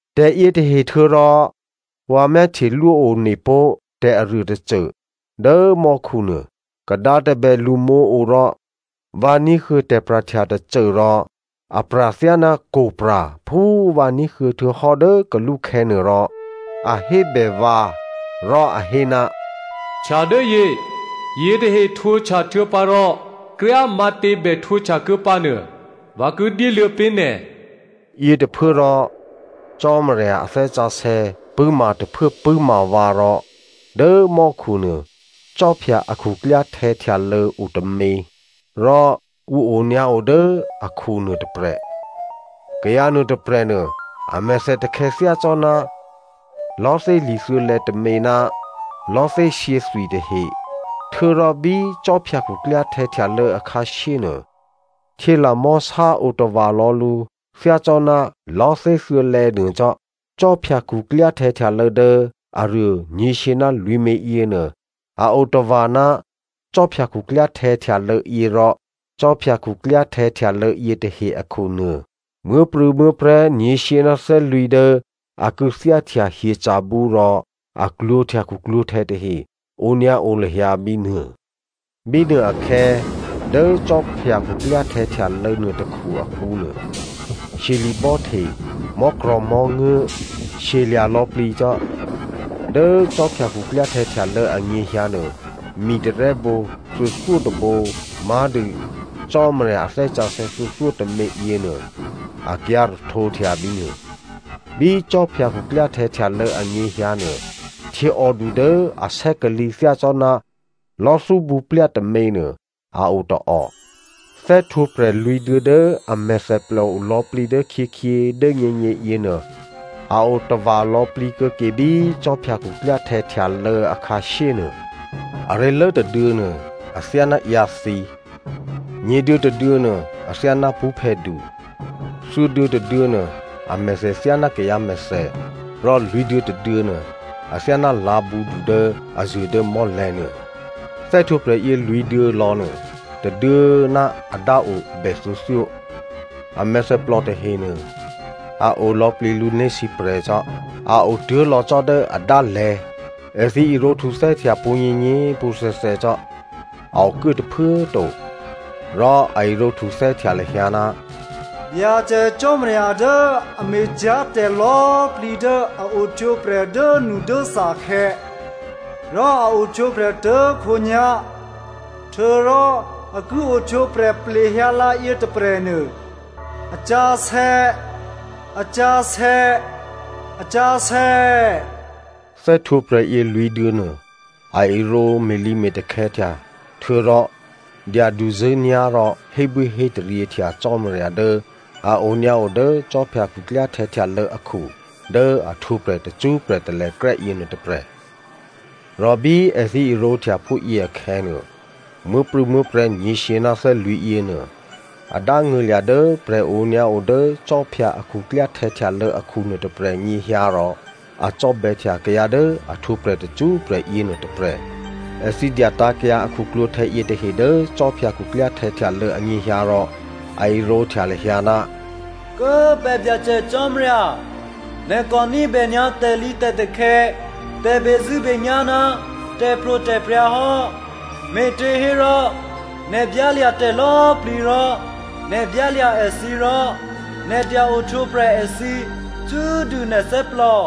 Tè̤yětahe htuô̌ rò vǎ myáhtyelwó onepó̤ tè̤aruô tôcô. Dố mò́khunuô, kadǎ tôbè lṳmǒo rò vǎ ní̤huô̌ tè̤pra̤htya tôcô rò a pra̤ thyáná kwo̤pra̤ phú vǎ ní̤huô̌ htuô̌hò́ dố kalúkhè̌ nuô, rò a hébè vǎ rò a hé, “Htyadốyě, yětahe htwǒhtya htuô̌pǎ rò kryá꤮ matě bè htwǒhtya ke pǎnuô, vǎ ki dyéluô̌ pé̤ nè̤.” Yětôphuốrò Cò́marya a Thè́ Sǎsè̌ pṳ̂́ma tôphuố pṳ̂́ma vǎ rò dố mò́khu nuô khwí a khuklyáhtè̌ htyalô̌ o tômě rò ǔ onyǎo dố akhu nuô tôprè̤. Kayǎ nuôtôprè̤ nuô amèthè takhè̌ thyácò́ná lò̤́thé li̤thuô̌lè̌ tômě ná lò̤́thé shyěthwi tahe, htuô̌rò bí khwí khuklyáhtè̌ htyalô̌ akhǎshyé nuô, htyělamò̤́sá o tava̤ lò̌ lǔ thyácò́ná lò̤́thé thuô̌lè̌ nuô cò́. Khwí khuklyáhtè̌ htyalô̌ dố aruô nyě̤shyě ná lwǐ̤mě yěnuô a otava̤ ná khwí khuklyáhtè̌ htyalô̌ yě rò khwí khuklyáhtè̌ htyalô̌ yětahe akhu nuô, muố̤prû̌muố̤prè̤́ nyě̤shyě ná thè́lwǐ̤ dố a kû̌thyáhtya hyeca̤bǔ rò a klwǒ̤htya khuklwǒ̤htè̌ tahe onyǎo lahyǎ bínuô. Bínuôakhè̌, dố khwí khuklyáhtè̌ htyalô̌ nuôtôkhu akǔ nuô, shyeli̤bò́ hte, mò́krò̤̌mò́nguố̤, shyelya̤ lò̌plǐ cò́. Dố khwí khuklyáhtè̌ htyalô̌ anyěhyǎnuô, mi tarè́bǒ thuô̌thyótôbǒ má̤dû Cò́marya a Thè́ Sǎsè̌ thuô̌thyótômě yěnuô, akyǎ̤ rahtǒhtya bínuô. Bí khwí khuklyáhtè̌ htyalô̌ anyěhyǎnuô, htyěòdu dố asè́kalǐ thyácò́ná lò̤́thú bǔplya tôměnuô a o tôò. Thè́htwǒprè̤ lwǐ̤duô̌ dố a mèthèplò o lò̌plǐ dốkhyěkhyě, dố nyěnyě yěnuô, a o tava̤ lò̌plǐ kuô̌ke bí khwí khuklyáhtè̌ htyalô̌ akhǎshyé nuô. Aré̤lố tôduô̌ nuô athyáná ǎyǎthǐ, nyě̤duô̌ tôduô̌ nuô athyáná pṳ́phè̌du, thuô̌duô̌ tôduô̌ nuô amèthè thyáná kayǎ mèthè rò lwǐ̤duô̌ tôduô̌ nuô, athyáná lǎ̤bǔdu dố a zuô̤ dố mò́lè̤̌nuô. Thè́htwǒprè̤yě lwǐ̤duô̌ lò̌nuô, tôduô̌꤮ ná a dáo a bè thuô̌thyó, a mèthèplò tahenuô, a o lò̌plǐ lǔné̤ sǐprè̤cò́, a o tuố̤ lò̌ cò́ dố adálè̤̌. Èthǐ irǒ htuthè́htya pwǒ̤nyěnyě꤮ pwǒ̤thè̌thè̌ cò́, a okuố tôphuố꤮ to. Rò a irǒ htuthè́htya lahyǎ, “Byacè Cò́marya dố a me̤cyá̤tè̤ lò̌꤮ plǐ dố a ohtwǒprè̤ dốnudốthakhè̌, rò a ohtwǒprè̤ tuố̤khǒnyá̤, htuô̌rò a ki ohtwǒprè̤ plehyǎlǎ yětôprè̤nuô, a sǎsè̌, a sǎsè̌, a sǎsè̌.” Thè́htwǒprè̤yě lwǐ̤duô̌nuô, a irǒ me̤lǐme̤takhè̌htya htuô̌rò dyaduzṳ̂́nyá̤ rò hébwíhétaryěhtya Cò́marya dố a onyǎo dố khwí khuklyáhtè̌ htyalô̌ akhu dố a htwǒprè̤ tacṳ́prè̤ talèkrè́ yěnuô tôprè̤. Rò bí èthǐ irǒhtya phúyě akhè̌nuô, muố̤prû̌muố̤prè̤́ nyě̤shyě ná thè́lwǐ̤ yěnuô a dángṳ̂lya̤ dố prè̤ onyǎo dố khwí a khuklyáhtè̌ htyalô̌ akhu nuôtôprè̤ nyěhyǎ rò a cò́bè̌htya kayǎ dố a htwǒprè̤ tacṳ́prè̤ yěnuô tôprè̤. Èthǐ dyatǎ̤kyǎ a khuklwǒ̤htè̌ yětahe dố khwí khuklyáhtè̌ htyalô̌ anyěhyǎ rò a irǒhtya lahyǎ, “Kố꤮ pè̤ Byacè Cò́marya, nè̤ kò ní̤bè nyǎ tè̤lǐtè̤takhè̌, tè̤bezṳ̂́benyá̤ ná tè̤pro̤tè̤prya̤ hò́, me̤těhérò nè̤ byálya̤ tè̤ lò̌꤮ plǐ rò nè̤ byálya̤ èthǐ rò nè̤ dya ohtwǒprè̤ èthǐ cṳ́꤮ dû nè̤ thè́plò.”